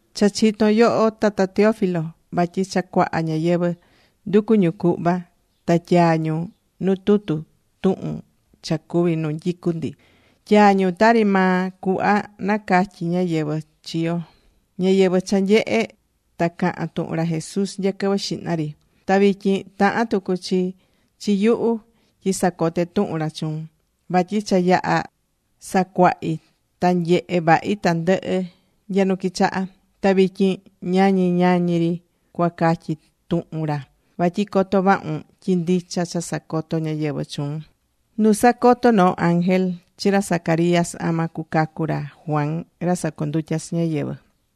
Cha chitón yoho Tata Teófilo, vatyi cha cuaha ñáyɨvɨ nducu̱ ñu cuhva ta tyaa̱ ñu nuu tutu tuhun cha cuvi̱ nu nyicú ndi. Tyaa̱ ñu tari maa cuhva nacatyi̱ ñáyɨvɨ chi yo, ñáyɨvɨ cha nyehe̱ ta cahán tuhun ra Jesús nya quɨvɨ xihna ri. Ta vityin tahán tucu chi chi yuhu tyi sacote tuhun ra chuun. Vatyi cha yaha̱ sacuahi̱ ta nyehe vahi tandɨhɨ nya nu quichaha̱. Ta vityin ñañi ñañi ri cuatyai tuhun ra. Vatyi coto vahun tyi ndicha cha sacoto̱ ñáyɨvɨ chuun. Nu sacoto̱ noo ángel chi ra Zacarías ama cucacu ra Juan ra sacondutyá chi ñáyɨvɨ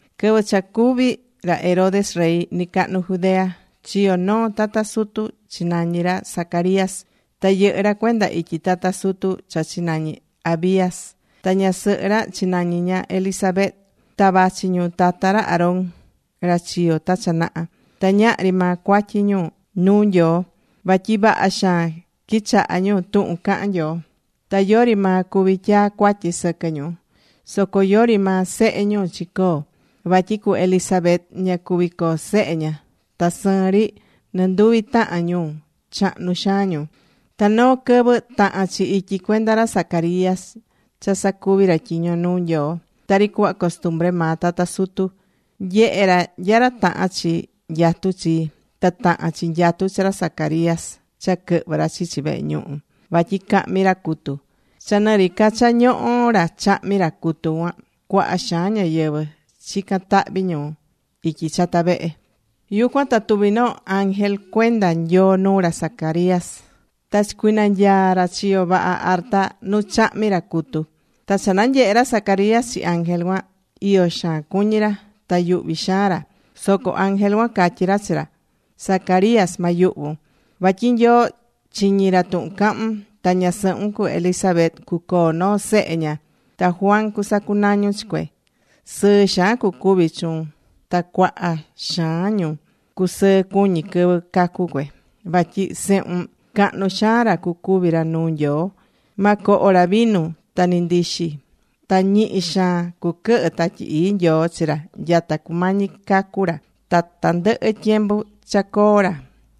Quɨvɨ cha cuví ra Herodes rey nɨcahnu Judea, chiyo̱ noo tata sutu, chinañi̱ ra Zacarías. Ta yɨhɨ̱ ra cuenda ityi tata sutu cha chinañi̱ Abías. Ta ñasɨhɨ ra chinañi̱ ña Elisabet. Ta vachi ñu tata ra Aarón, ra chiyo̱ ta cha naha. Ta ñahri maa cuatyi ñu iyó nuu Nyoo. Vatyi vaha xaan quichahá ñu tuhun cahán Nyoo. Ta yori maa cuví tyaa cuatyi sɨquɨ ñu. Soco yori maa sehe ñu chicoo̱. Vatyi cu Elisabet, ña cuví coo sehe ña. Ta sɨɨn ri nɨnduvi tahan ñu chahnu xaan ñu. Ta noo quɨvɨ taha̱n chi ityi cuenda ra Zacarías cha sacuvi ra tyiño nuu Nyoo. Tari cuhva costumbre maa tata sutu, nyehe̱ ra nya ra taha̱n chi nyatu chi. Ta taha̱n chi nyatu chi ra Zacarías cha quɨhvɨ ra chichi vehe ñuhu, vatyi cahmi ra cutu. Cha nɨ ri ca cha ñohó ra chahmí ra cutu cuan, cuaha xaan ñáyɨvɨ chicán tahvi ñu ityi chata vehe. Yucuan ta tuvi̱ noo ángel cuenda Nyoo nuu ra Zacarías. Ta chicuinanyaa̱ ra chiyo vaha arta nu chahmí ra cutu. Ta cha nanyehe̱ ra Zacarías chi ángel cuan, iyo xaan cuñí ra. Ta yuhví xaan ra. Soco ángel cuan catyí ra chi ra: ―Zacarías, ma yuhvun. Vatyi Nyoo chiñí ra tuhun cahún. Ta ñasɨhun cu Elisabet cucoo noo sehe ña. Ta Juan cusacunañun chi cue. Sɨɨ xaan cucuvi chuun. Ta cuaha xaan ñu, cusɨɨ cuñi quɨvɨ cacu cue. Vatyi sehun, cahnu xaan ra cucuví ra nuu Nyoo. Ma coho ra vinu ta ni ndixi. Ta ñihi xaan cuquɨhɨ Tatyi Ii Nyoo chi ra nyata cumañi cacu ra ta tandɨhɨ tyembu cha coo ra.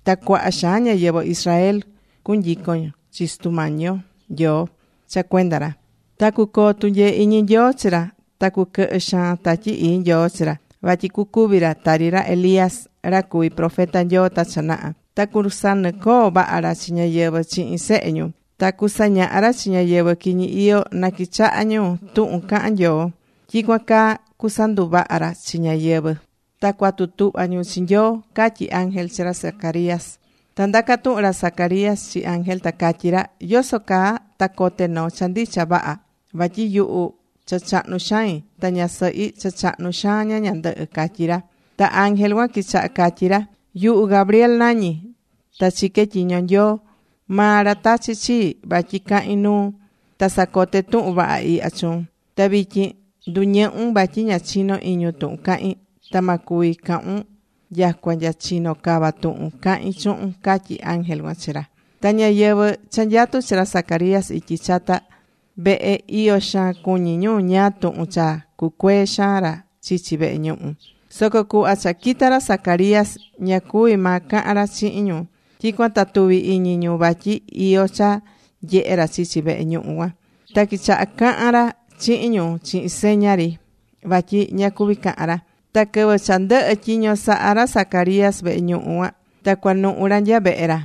Ta cuaha xaan ñáyɨvɨ Israel cunyicon chi Sutu yo Nyoo cha cuenda ra. Ta cucoo tunyee iñi Nyoo chi ra. Ta cuquɨhɨ xaan Tatyi Ii Nyoo chi ra. Vatyi cucuvi ra tari ra Elías, ra cuvi̱ profeta Nyoo ta cha naha. Ta cusanɨcoo vaha ra chi ñáyɨvɨ chihin sehe ñu. Ta cusañaha ra chi ñáyɨvɨ quiñi iyó na quichaha ñu tuhun cahán Nyoo. Tyicuan caa cusanduvaha ra chi ñáyɨvɨ ta cuatu tuhva ñu chi Nyoo ―catyí ángel chi ra Zacarías. Ta ndaca tuhun ra Zacarías chi ángel, ta catyí ra: ―¿Yoso caa ta cote noo cha ndicha vaha? Vatyi yuhu cha chahnu xain. Ta ñasɨhi cha chahnu xaan ña ñandɨhɨ ―catyí ra. Ta ángel cuan quichaha̱ catyi ra: ―Yuhu Gabriel nañí. Ta chiqué tyiño Nyoo. Maa ra tachi̱ chii vatyi cahin nuun ta sacote tuhun vaha ihya chuun. Ta vityin nduñɨhun. Vatyi ña chinó iñun tuhun cahín. Ta ma cuvi cahun nyacua nya chino cava tuhun cahi̱n chuhun ―catyí ángel cuan chi ra. Ta ñáyɨvɨ cha nyatú chi ra Zacarías ityi chata vehe, iyo xaan cuñí ñu ñáá tuhun cha cucuee xaan ra chichi vehe ñuhu. Soco cuhva cha quita̱ ra Zacarías, ña cuví maa cahan ra chihin ñu. Tyicuan ta tuvi̱ iñi ñu vatyi iyó cha nyehe̱ ra chichi vehe ñuhu cuan. Ta quichaha̱ cahan ra chihin ñu chihin seña ri. Vatyi ña cuví cahan ra. Ta quɨvɨ cha ndɨhɨ̱ tyiño saha ra Zacarías vehe ñuhu cuan, ta cuanuhu ra nya vehe ra.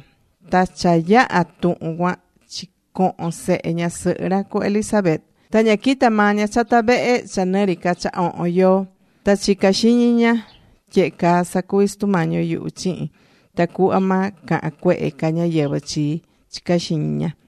Ta cha yaha̱ tuhun cuan chicoho̱n sehe ñasɨhɨ ra, cu Elisabet. Ta ña quita̱ maa ña chata vehe cha nɨ ri ca cha ohon yoo. Ta chicá xiñi ña: “Tyehe caa sacuví Sutu Mañi yuhu chihin, tacuhva ma cahan cuehe ca ñáyɨvɨ chii”, chicá xiñi ña.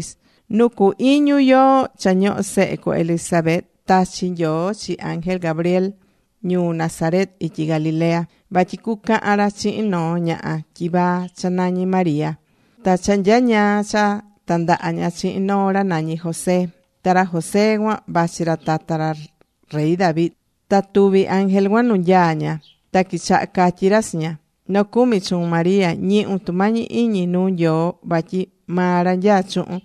Nu cu iñu yoo cha ñohó sehe cu Elisabet, tachi̱ Nyoo chi ángel Gabriel ñuu Nazaret ityi Galilea. Vatyi cucahan ra chihin noo ñaha tyivaa cha nañí María. Ta cha nyañaa cha tandaha ña chihin noo ra nañí José. Ta ra José cuan vachi ra tata rey David. Ta tuvi̱ ángel cuan nu nyaá ña. Ta quichaha̱ catyi ra chi ña: ―Nocumi chuun, María. Ñihun tumañi iñi nuu Nyoo. Vatyi maa ra nyaá chuhun.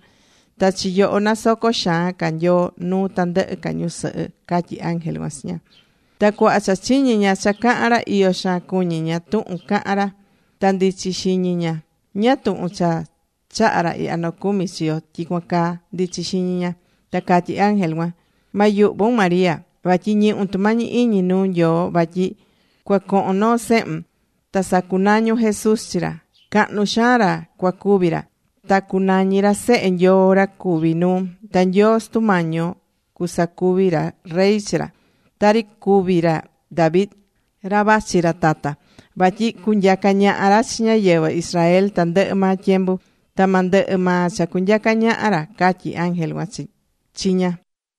Ta chi yoho nasocó xaan ca Nyoo nuu tandɨhɨ ca ñusɨhɨ ―catyí ángel cuan chi ña. Ta cuhva cha chiñi̱ ña cha caha̱n ra, iyo xaan cuñi ña tuhun caha̱n ra. Ta ndichí xiñi ña: “¿Ñáá tuhun cha chaha̱ ra ihya nocumi chi yo tyicuan caa?” ndichí xiñi ña. Ta catyí ángel cuan: ―Ma yuhvun, María, vatyi ñihún tumañi iñi nuu Nyoo. Vatyi cuacohon noo sehun. Ta sacunañun Jesús chi ra. Cahnu xaan ra cuacuvi ra. Ta cunañi ra Sehe Nyoo ra cuvi nuu. Ta Nyoo Sutu Mañi yo cusacuvi ra rey chi ra. Tari cuvi̱ ra David, ra vachi ra tata. Vatyi cunyaca ñaha ra chi ñáyɨvɨ Israel tandɨhɨ maa tyembu. Ta ma ndɨhɨ maa cha cunyaca ñaha ra ―catyí ángel cuan chi ña.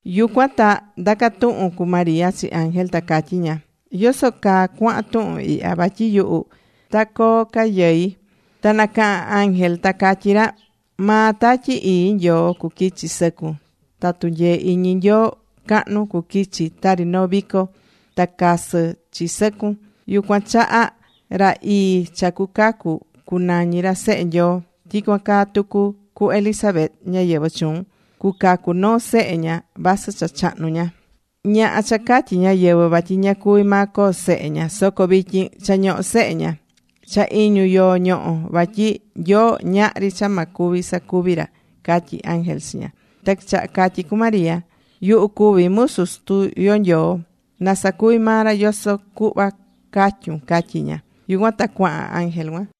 Yucuan ta ndaca̱ tuhun cu María chi ángel, ta catyí ña: ―¿Yoso caa cuahan tuhun ihya? Vatyi yuhu, ta coo ca yɨi. Ta nacaha̱n ángel ta catyí ra: ―Maa Tatyi Ii Nyoo cuquichi sɨcun. Ta tunyee iñi Nyoo cahnu cuquichi tari noo vico ta casɨ chi sɨcun. Yucuan chaha ra ii cha cucacu cunañi ra Sehe Nyoo. Tyicuan caa tucu cu Elisabet ñáyɨvɨ chuun. Cucacu noo sehe ña vasɨ cha chahnu ña. Ñaha cha catyí ñáyɨvɨ vatyi ña cuví maa coo sehe. Soco vityin cha ñohó sehe ña. Cha iñu yoo ñohó. Vatyi Nyoo ñahri cha ma cuvi sacuvi ra ―catyí ángel chi ña. Ta quichaha catyí cu María: ―Yuhu cuví musu Sutu yo Nyoo. Na sacuvi maa ra yoso cuhva catyún ―catyí ña. Yucuan ta cuahan ángel cuan.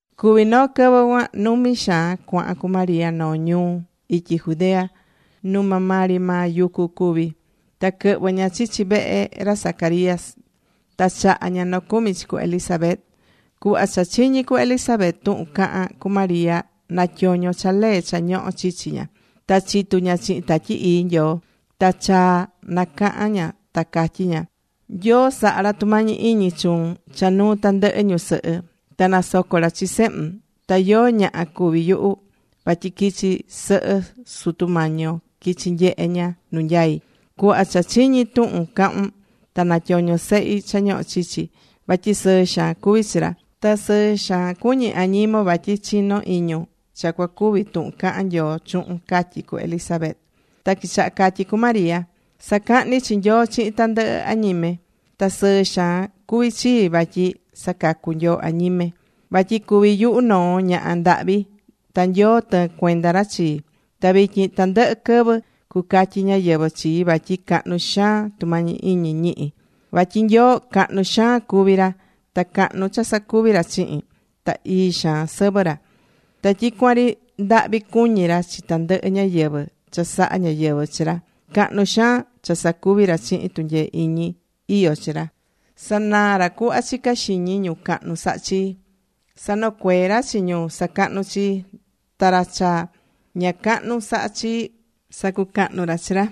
Cuví noo quɨvɨ cuan, numi xaan cuahan cu María noo ñuu ityi Judea nu maa ri maa yucu cuví. Ta quɨhvɨ̱ ña chichi vehe ra Zacarías. Ta chaha̱ ña nocumi chi cu Elisabet. Cuhva cha chiñi̱ cu Elisabet tuhun caha̱n cu María, natyoño̱ cha lee cha ñohó chichi ña. Ta chitu ña chihin Tatyi Ii Nyoo. Ta chaa nacaha̱n ña, ta catyí ña: ―Nyoo sahá ra tumañi iñi chuun cha nuu tandɨhɨ ñusɨhɨ. Ta nasocó ra chi sehun. ¿Ta yóó ñaha cuví yuhu? Vatyi quichi sɨhɨ Sutu Mañi yo quichi̱ nyehe ña nu nyai. Cuhva cha chiñi̱ tuhun cahu̱n, ta natyoño̱ sehi cha ñohó chichi. Vatyi sɨɨ xaan cuví chi ra. Ta sɨɨ xaan cuñí añimon vatyi chinó iñun cha cuacuvi tuhun cahán Nyoo chuhun ―catyí cu Elisabet. Ta quichaha̱ catyi cu María: ―Sacahní chi Nyoo chihin tandɨhɨ añime. Ta sɨɨ xaan cuví chii vatyi sacacú Nyoo añime. Vatyi cuví yuhu noo ñaha ndahvi ta Nyoo tɨɨn cuenda ra chii. Ta vityin tandɨhɨ quɨvɨ cucatyi ñáyɨvɨ chii vatyi cahnu xaan tumañi iñi ñihi̱. Vatyi Nyoo, cahnu xaan cuví ra. Ta cahnu cha sacuví ra chihin. Ta ii xaan sɨvɨ ra. Ta tyicuan ri ndahvi cuñí ra chi tandɨhɨ ñáyɨvɨ cha sahá ñáyɨvɨ chi ra. Cahnu xaan cha sacuví ra chihin tunyee iñi iyó chi ra. Sanaá ra cuhva chicá xiñi ñu cahnu sahá chi. Sanocueé ra chi ñu sacahnú chii. Ta ra cha ña cahnu sahá chii, sacucahnú ra chi ra.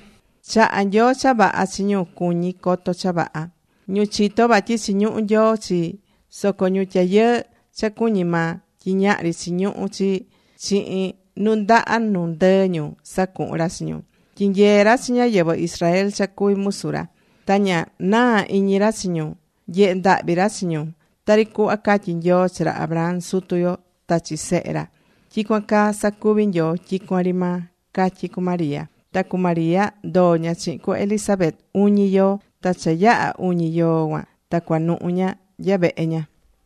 Chahá Nyoo cha vaha chi ñu cuñí coto cha vaha, ñu chitó vatyi chiñuhú Nyoo chi. Soco ñu tyayɨɨ cha cuñí maa tyi ñahri chiñuhu chi, chihin nundaha nu ndɨɨ ñu, sacuhún ra chi ñu. Tyinyeé ra chi ñáyɨvɨ Israel cha cuví musu ra. Ta ña naá iñi ra chi ñu. Nyehé ndahvi ra chi ñu. Tari cuhva catyí Nyoo chi ra Abraham, sutu yo, ta chi sehe ra, tyicuan caa sacuví Nyoo tyicuan ri maa ―catyí cu María. Ta cu María ndoo̱ ña chihin cu Elisabet uñi yoo. Ta cha yaha̱ uñi yoo cuan ta cuanuhu̱ ña nya vehe ña.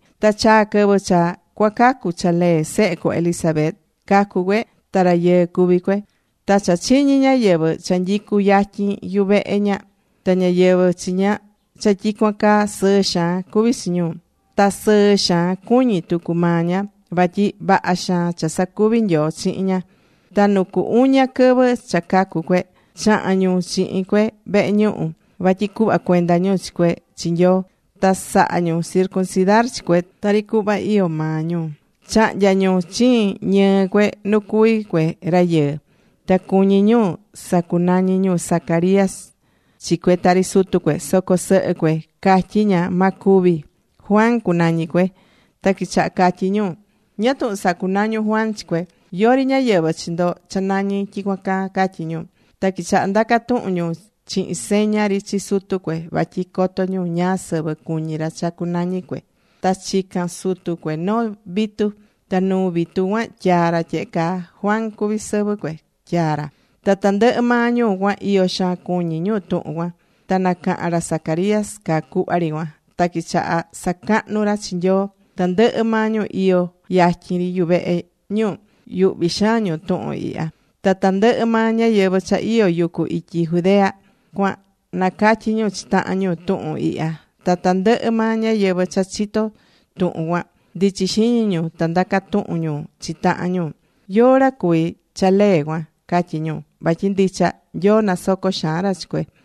Ta chaa̱ quɨvɨ cha cuacacu cha lee sehe cu Elisabet. Cacu̱ cue ta rayɨɨ cuví cue. Ta cha chiñi̱ ñáyɨvɨ cha nyicú yatyin yuvehe ña ta ñáyɨvɨ chi ña cha tyicuan caa, sɨɨ xaan cuví chi ñu. Ta sɨɨ xaan cuñí tucu maa ña. Vatyi vaha xaan cha sacuvi̱ Nyoo chihin ña. Ta nu cu uña quɨvɨ cha cacu̱ cue, chaha̱n ñu chihin cue vehe ñuhu. Vatyi cuhva cuenda ñu chi cue chi Nyoo. Ta saha̱ ñu circuncidar chi cue tari cuhva iyó maa ñu. Chahnya̱ ñu chiin ñɨɨ cue nu cuví cue rayɨɨ. Ta cuñí ñu sacunañi ñu Zacarías chi cue tari sutu cue. Soco sɨhɨ cue catyí ña: ―Ma cuvi. Juan, cunañi cue. Ta quichaha catyí ñu: ―¿Ñáá tuhun sacunañún Juan chi cue? Yori ñáyɨvɨ chi ndo cha nañí tyicuan caa ―catyí ñu. Ta quichaha ndaca tuhun ñu chihin seña ri chi sutu cue. Vatyi coto ñu ñáá sɨvɨ cuñí ra cha cunañi cue. Ta chica̱n sutu cue noo vitu, ta nuu vitu cuan tyaa̱ ra tyehe caa: “Juan cuví sɨvɨ cue”, tyaa̱ ra. Ta tandɨhɨ maa ñu cuan iyo xaan cuñí ñu tuhun cuan. Ta nacaha̱n ra Zacarías caa cuhva ri cuan. Ta quichaha̱ sacahnu ra chi Nyoo. Tandɨhɨ maa ñu iyó yatyin ri yuvehe ñu, yuhví xaan ñu tuhun ihya. Ta tandɨhɨ maa ñáyɨvɨ cha iyó yucu ityi Judea cuan nacatyí ñu chi tahan ñu tuhun ihya. Ta tandɨhɨ maa ñáyɨvɨ cha chitó tuhun cuan, ndichi̱ xiñi ñu, ta ndaca̱ tuhun ñu chi tahan ñu: ―¿Yóó ra cuví cha lee cuan? ―catyí ñu. Vatyi ndicha, Nyoo nasoco xaan ra chi cue.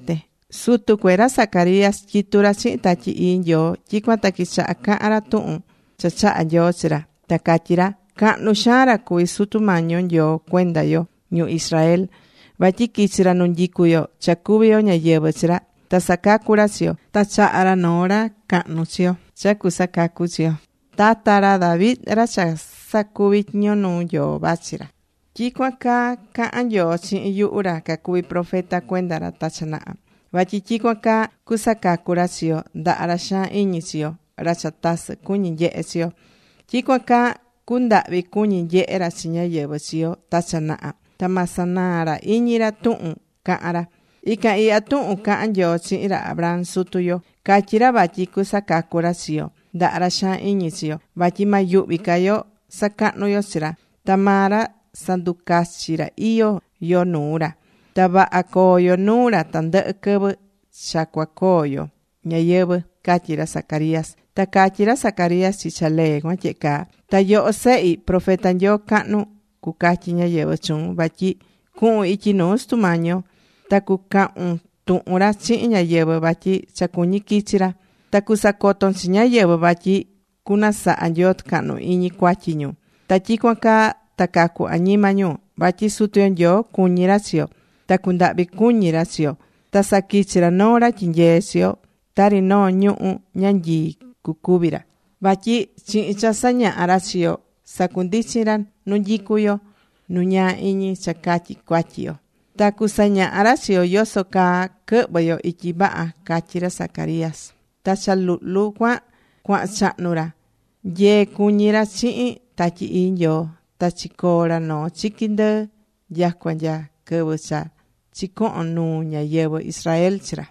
Sutu cue, ra Zacarías, tyitú ra chihin Tatyi Ii Nyoo. Tyicuan ta quichaha̱ cahan ra tuhun cha chahá Nyoo chi ra, ta catyí ra: ―Cahnu xaan ra cuví Sutu Mañi yo Nyoo cuenda yo ñu Israel. Vatyi quichi̱ ra nu nyicú yo, cha cuví yo ñáyɨvɨ chi ra. Ta sacacu̱ ra chi yo. Ta chaha̱ ra noo ra cahnu chi yo, cha cusacacu chi yo. Tata ra David ra cha sacuvi̱ tyiño nuu Nyoo vachi ra. Tyicuan caa caha̱n Nyoo chihin yuhu ra cacuví profeta cuenda ra ta cha naha. Vatyi tyicuan caa cusacacu ra chi yo ndaha ra xaan iñi chi yo, ra cha tasɨ cuñí nyehé chi yo. Tyicuan caa cundahvi cuñí nyehé ra chi ñáyɨvɨ chi yo ta cha naha. Ta ma sanaa ra iñi ra tuhun caha̱n ra. Ican ihya tuhun caha̱n Nyoo chihin ra Abraham sutu yo. Catyí ra vatyi cusacacu ra chi yo ndaha ra xaan iñi chi yo. Vatyi ma yuhvi ca yo sacahnu yo chi ra. Ta maa ra sanducachi ra iyó yo nuu ra. Ta vaha coo yo nuu ra tandɨhɨ quɨvɨ cha cuacoo yo ñayɨvɨ̱ ―catyí ra Zacarías. Ta catyí ra Zacarías chi cha lee cuan tyehe caa: ―Ta yoho sehi, profeta Nyoo cahnu cucatyí ñáyɨvɨ chuun. Vatyi cuhun ityi nuu Sutu Mañi yo. ta cucahun tuhun ra chihin ñáyɨvɨ vatyi cha cuñí quichi ra. Ta cusacoton chi ñáyɨvɨ vatyi cunasaha Nyoo tucahnu iñi cuatyi ñu. Ta tyicuan caa ta cacu añima ñu. Vatyi Sutu yo Nyoo cuñí ra chi yo. Ta cundahvi cuñí ra chi yo. Ta saquichí ra noo ra tyinyeé chi yo. Tari noo ñuhu̱ ñanyii cucuvi ra. Vatyi chihin cha sañahá ra chi yo sacundichín ra nu nyicú yo nu ñaa iñi cha catyi cuatyi yo. Ta cusañaha ra chi yo yoso caa quɨhvɨ yo ityi vaha ―catyí ra Zacarías. Ta cha luhlu cuan cuahan chahnu ra. Nyee cuñí ra chihin Tatyi Ii Nyoo. Ta chicoo̱ ra noo chiqui ndɨɨ nyacua nya quɨvɨ cha chicoho̱n nuu ñáyɨvɨ Israel chi ra.